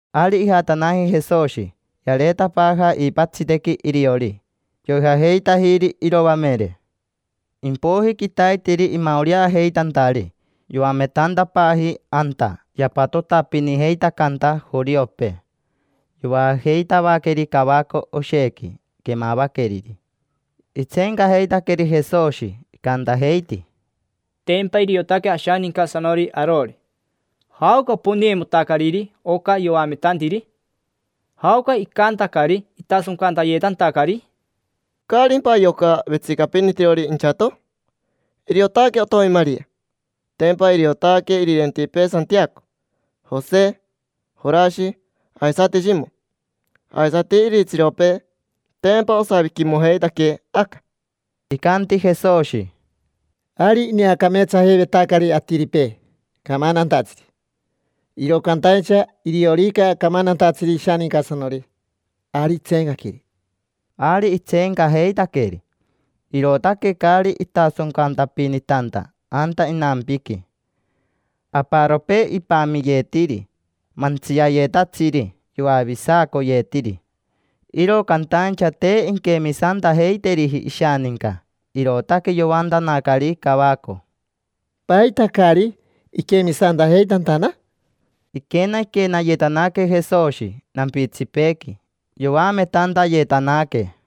Ari ijatanaji Jesoshi, yareetapaaja iipatsitequi iriori. Yoijajeitajiri iroamere. Impoiji quitaiteri imaoreajeitantari, yoametantapaaji anta yapatotapinijeitacanta joriopee. Yoajeitavaqueri cavaco oshequi quemavaqueriri. Itseencajeitaqueri Jesoshi, icantajeiti: —Tempa iriotaque ashanincasanori arori. ¿Jaoca oponeimotacariri oca yoametantiri? ¿Jaoca icantacari itasoncantayetantacari? ¿Caarimpa yoca vetsicapinitirori inchato? Iriotaque otomi Maria, tempa iriotaque irirentipee Santiaco, Jose, Jorashi, aisati Shimo. Aisati iritsiropee, tempa osaviquimojeitaquee aca. Icanti Jesoshi: —Ari ineacameetsajeivetacari atiripee camantantatsiri. Iro cantaincha iriorica camantantatsiri ishanincasanori, ari intseenqueri. Ari itseencajeitaqueri, irootaque caari itasoncantapinitanta anta inampiqui. Aparopee ipamiyetiri mantsiayetatsiri, yoavisacoyetiri. Iro cantaincha te inquemisantajeiteriji ishaninca, irootaque yoantanacari cavaco: —¿Paita caari iquemisantajeitantana? Iquenaquenayetanaque Jesoshi nampitsipeequi, yoametantayetanaque.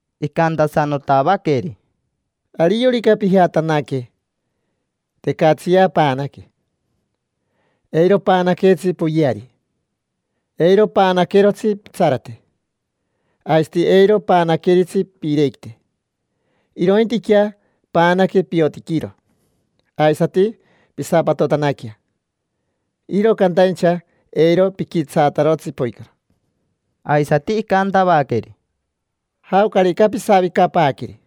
Icantasanotavaqueri: —Ariorica pijatanaque, tecatsiyea paanaque. Eiro paanaquetsi poyeari, eiro paanaquerotsi pitsarate. Aisati eiro paanaqueritsi piirequite. Irointiquea paanaque piotiquiro. Aisati pisapatotanaquea, iro cantaincha eiro piquitsaatarotsi poicoro. Aisati icantavaqueri: —Jaocarica pisavicapaaqueri,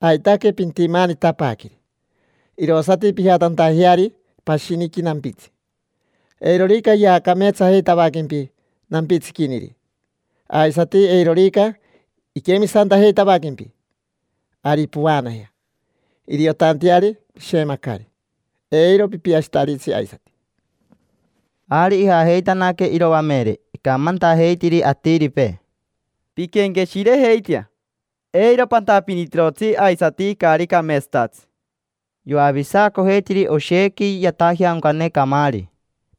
aitaque pintimaanitapaaqueri, irosati pijatantajeari pashiniqui nampitsi. Eirorica yaacameetsajeitavaquempi nampitsiquiniri, aisati eirorica iquemisantajeitavaquempi, ari povaanajea, iriotanteari pishemacari, eiro pipiashitaritsi aisati. Ari ijajeitanaque iroamere. Icamantajeitiri atiripee: —Pinquenqueshirejeitea, eiro pantapinitirotsi aisati caari cameetsatatsi. Yoavisacojeitiri oshequi yatajeaoncane camaari.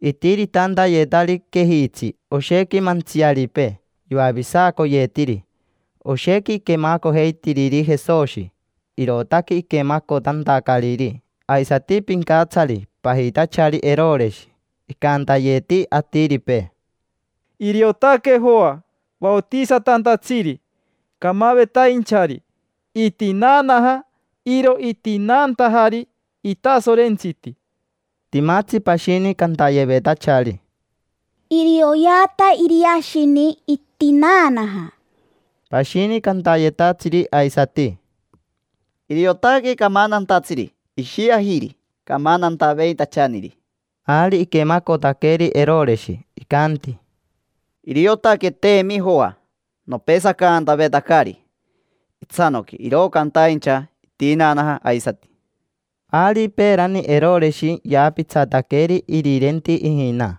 Itiritantayetari quejitsi oshequi mantsiaripee, yoavisacoyetiri. Oshequi quemacojeitiriri Jesoshi, irootaque iquemacotantacariri aisati pincatsari pajitachari Eroreshi. Icantayeti atiripee: —Iriotaque Joa vaotisatantatsiri, camavetainchari: itinaanaja. Iro itinaantajari itasorentsiti. Timatsi pashini cantayevetachari: —Irioyeata Iriashini: itinaanaja. Pashini cantayetatsiri aisati: —Iriotaque camantantatsiri. Ishiajiri camantantaveitachaniri. Ari iquemacotaqueri Eroreshi, icanti: —Iriotaqueteemi Joa. Nopesacantavetacari itsanoqui iro cantaincha itinaanaja aisati. Ari peerani Eroreshi yaapitsataqueri irirenti ijina.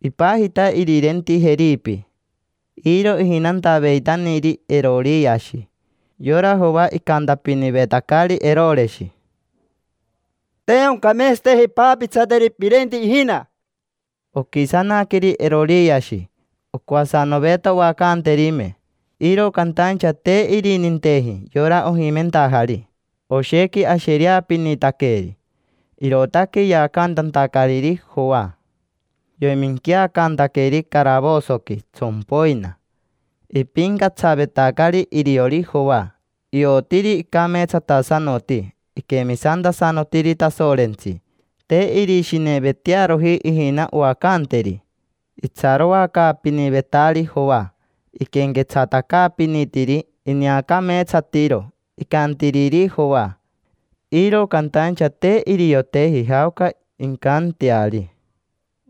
Ipajita irirenti Jeripi, iro ijinantaveitaniri, Eroriashi. Yora Joa icantapinivetacari Eroreshi: —Te oncameetsateji paapitsateri pirenti ijina. Oquisanaqueri Eroriashi, ocoasanoveta oacanterime, iro cantaincha te irininteji yora ojimentajari. Oshequi ashereapinitaqueri, irootaque yaacantantacariri Joa, yoiminquiacantaqueri caravosoqui tsompoina. Ipincatsavetacari iriori Joa, iotiri icameetsatasanoti, iquemisantasanotiri Tasorentsi. Te irishinevetearoji ijina oacanteri. Itsaroacaapinivetari Joa, iquenquetsatacaapinitiri. Ineacameetsatiro icantiriri Joa, iro cantaincha te irioteji jaoca incanteari.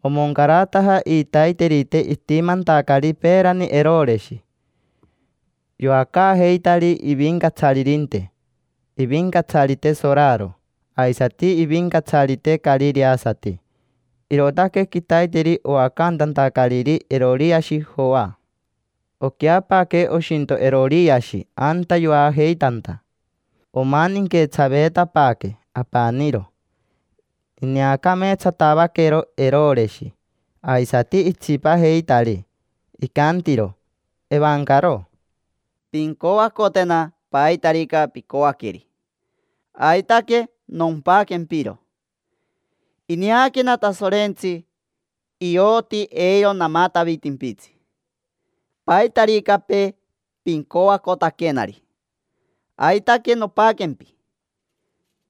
Omoncarataja iitaiterite itimantacari peerani Eroreshi. Yoacaajeitari ivincatsaririnte, ivincatsarite soraro, aisati ivincatsarite carireasati. Irootaque quitaiteri oacantantacariri Eroriashi Joa. Oqueapaaque oshinto Eroriashi anta yoajeitanta omaninquetsaveetapaaque apaniro. Ineacameetsatavaquero Eroreshi aisati itsipajeitari. Icantiro evancaro: —Pincoacotena paitarica picoaqueri. Aitaque nompaquempiro. Ineaquena Tasorentsi, ioti eiro namatavitimpitsi. Paitaricapee pincoacotaquenari, aitaque nompaquempi.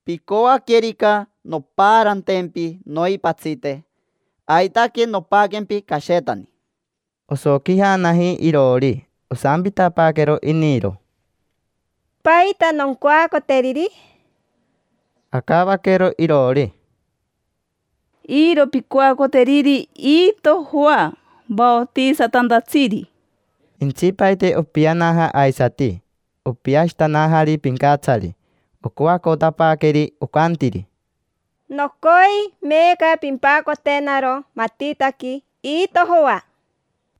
Picoaquerica nompaarantempi noipatsite, aitaque nompaquempi cashetani. Osoquijanaji iroori, osampitapaaquero iniro: —¿Paita noncoacoteriri? Acavaquero iroori: —Iro pincoacoteriri iito Joa vaotisatantatsiri. Intsipaite opianaja aisati, opiashitanajari pincatsari. Ocoacotapaaqueri, ocantiri: —Nocoi meeca pimpacotenaro matitaqui iito Joa.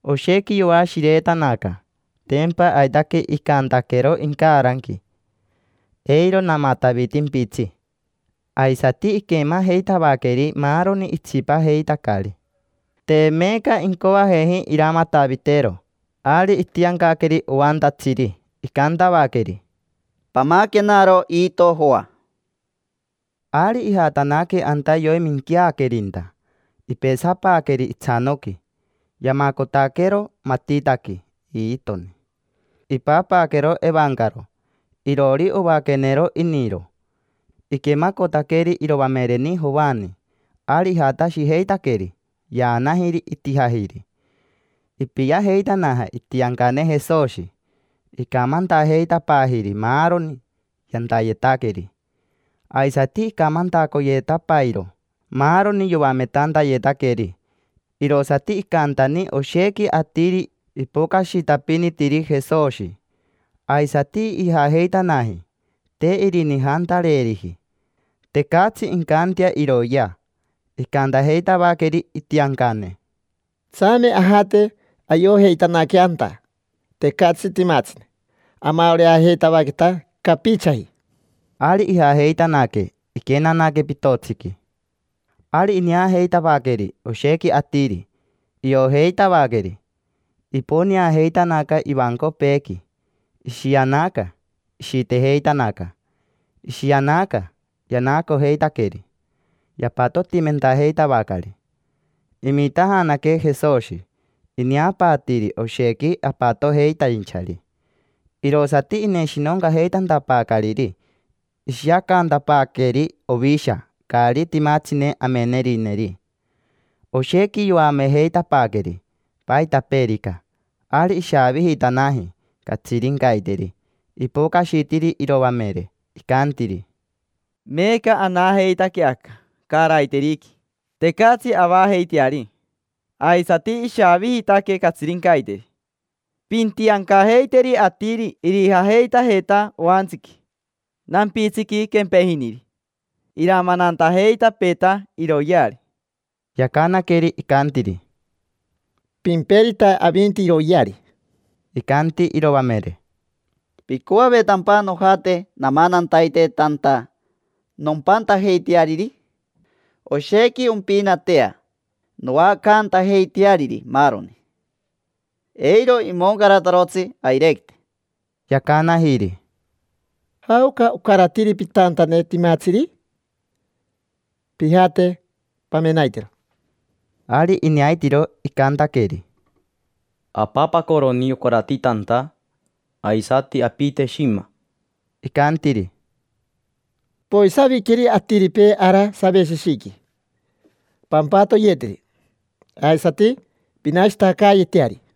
Oshequi yoashiretanaca. Tempa aitaque icantaquero incaranqui: “Eiro namatavitimpitsi”. Aisati iquemajeitavaqueri maaroni itsipajeitacari. Te meeca incoajeji iramatavitero. Ari itiancaqueri oantatsiri, icantavaqueri: —Pamaquenaro iito Joa. Ari ijatanaque anta yoiminqueaquerinta, ipesapaaqueri itsanoqui. Yamacotaquero matitaqui iitoni, ipapaaquero evancaro. Iroori, ovaaquenero iniro. Iquemacotaqueri iroamereni Joani, ari ijatashijeitaqueri. Yaanajiri, itijajiri. Ipiajeitanaja itiancane Jesoshi. Icamantajeitapaajiri maaroni yantayetaqueri. Aisati icamantacoyetapairo maaroni yoametantayetaqueri. Irosati icantani oshequi atiri ipocashitapinitiri Jesoshi, aisati ijajeitanaji. Te irinijantareeriji, tecatsi incantea iroyea. Icantajeitavaqueri itiancane: —Tsame ajate ayojeitanaquea anta tecatsi timatsine. Amaoreajeitavaqueta capichaji. Ari ijajeitanaque, iquenanaque pitotsiqui. Ari ineajeitavaqueri oshequi atiri, iojeitavaqueri. Iponeajeitanaca ivancopeequi, ishianaca, ishitejeitanaca. Ishianaca, yanaacojeitaqueri, yapatotimentajeitavacari. Imitajanaque Jesoshi, ineapaatiiri oshequi apatojeitainchari. Irosati ineshinoncajeitantapaacariri ishiacaantapaaqueri ovisha caari timatsine amenerineri. Oshequi yoamejeitapaaqueri paitapeerica. Ari ishaavijitanaji catsirincaiteri. Ipocashitiri iroamere, icantiri: —Meeca anajeitaque aca caaraiteriqui, tecatsi avajeiteari. Aisati ishaavijitaque catsirincaiteri. Pintiancajeiteri atiri irijajeitajeta oantsiqui, nampitsiqui quempejiniri. Iramanantajeitapeeta iroyeari. Yacanaqueri, icantiri: —Pimperita avinti iroyeari. Icanti iroamere: —¿Picoavetampa nojate namanantaite tanta nompantajeiteariri? Oshequi ompinatea noacantajeiteariri maaroni, eiro imoncaratarotsi airequite. Yacanajiri: —¿Jaoca ocaratiri pitantane timatsiri? Pijate, pamenaitero. Ari ineaitiro, icantaqueri: —Apapacoroni ocarati tanta, aisati apite shima. Icantiri: —Poisaviqueri atiripee ara saveshishiqui. Pampatoyeteri, aisati pinashitacaayeteari.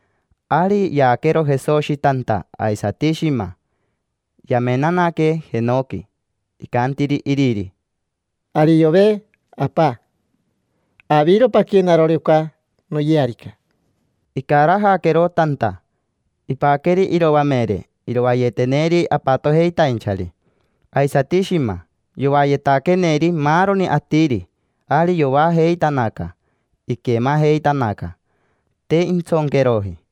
Ari yaaquero Jesoshi tanta aisati shima, yamenanaque jenoqui. Icantiri iriri: —Ariove, Apa, aviro paquenarori oca noyearica. Icarajaquero tanta. Ipaqueri iroamere irovayeteneri apatojeitainchari. Aisati shima, yovayetaqueneri maaroni atiri, ari yoajeitanaca. Iquemajeitanaca, te intsonqueroji.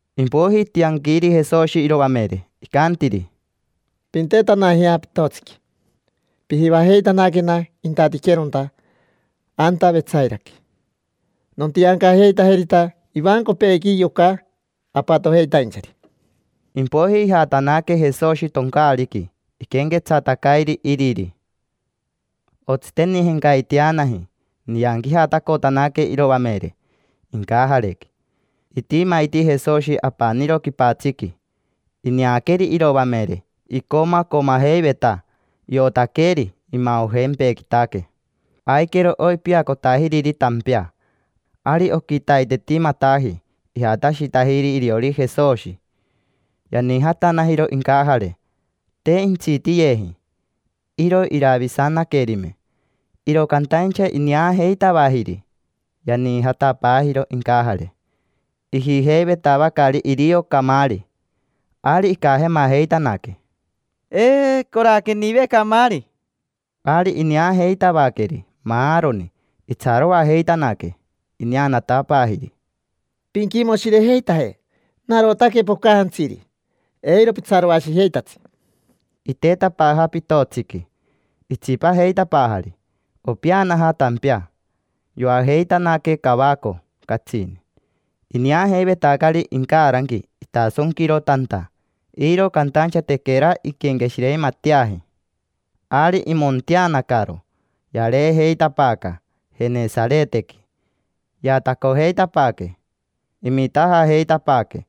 Impoiji itianquiri Jesoshi iroamere, icantiri: —Pintetanajea pitotsiqui. Pijivajeitanaquena intatiqueronta, anta Vetsairaqui: nontiancajeitajerita ivancopeequi yoca apatojeitainchari. Impoiji ijatanaque Jesoshi toncaariqui, iquenquetsatacairi iriri. Otsitenijencaiteanaji, inianquijatacotanaque iroamere incajarequi. Itimaiti Jesoshi apaniro quipatsiqui. Ineaqueri iroamere, icomacomajeiveta, iotaqueri imaojempequitaque. Aiquero oipiacotajiriri tampea. Ari oquitaitetimataji ijatashitajiri iriori Jesoshi. Yaniijatanajiro incajare, te intsitiyeji. Iro iravisanaquerime, iro cantaincha ineajeitavajiri, yaniijatapaajiro incajare. Ijijeivetavacari irio camaari. Ari icajemajeitanaque: —Eeeee. Coraquenive camaari. Ari ineajeitavaqueri maaroni. Itsaroajeitanaque. Ineanatapaajiri: —Pinquimoshirejeitaje. Narotaque pocajantsiri. Eiro pitsaroashijeitatsi. Itetapaaja pitotsiqui, itsipajeitapaajari, opeanaja tampea. Yoajeitanaque cavaco catsini. Ineajeivetacari incaranqui itasonquiro tanta, iro cantaincha tequera inquenqueshireimateaji. Ari imonteanacaro, yareejeitapaaca Jenesaretequi. Yaatacojeitapaaque. Imitajajeitapaaque,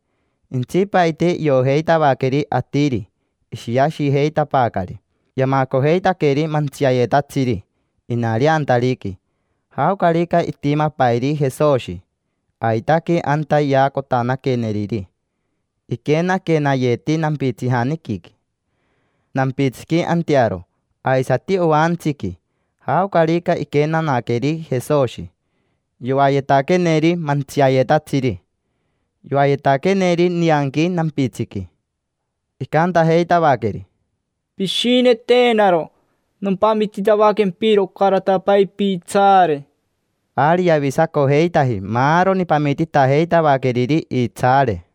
intsipaite iojeitavaqueri atiri. Ishiashijeitapaacari. Yamacojeitaqueri mantsiayetatsiri inareantariqui. Jaocarica itimapairi Jesoshi, aitaque anta yaacotanaqueneriri. Iquenaquenayeti nampitsijaniquiqui, nampitsiqui antearo, aisati oantsiqui. Jaocarica iquenanaqueri Jesoshi yoayetaqueneri mantsiayetatsiri. Yoayetaqueneri nianqui nampitsiqui, icantajeitavaqueri: —Pishinetenaro nompamititavaquempiro ocaratapai piitsaare. Ari yavisacojeitaji maaroni pamititajeitavaqueriri iitsaare.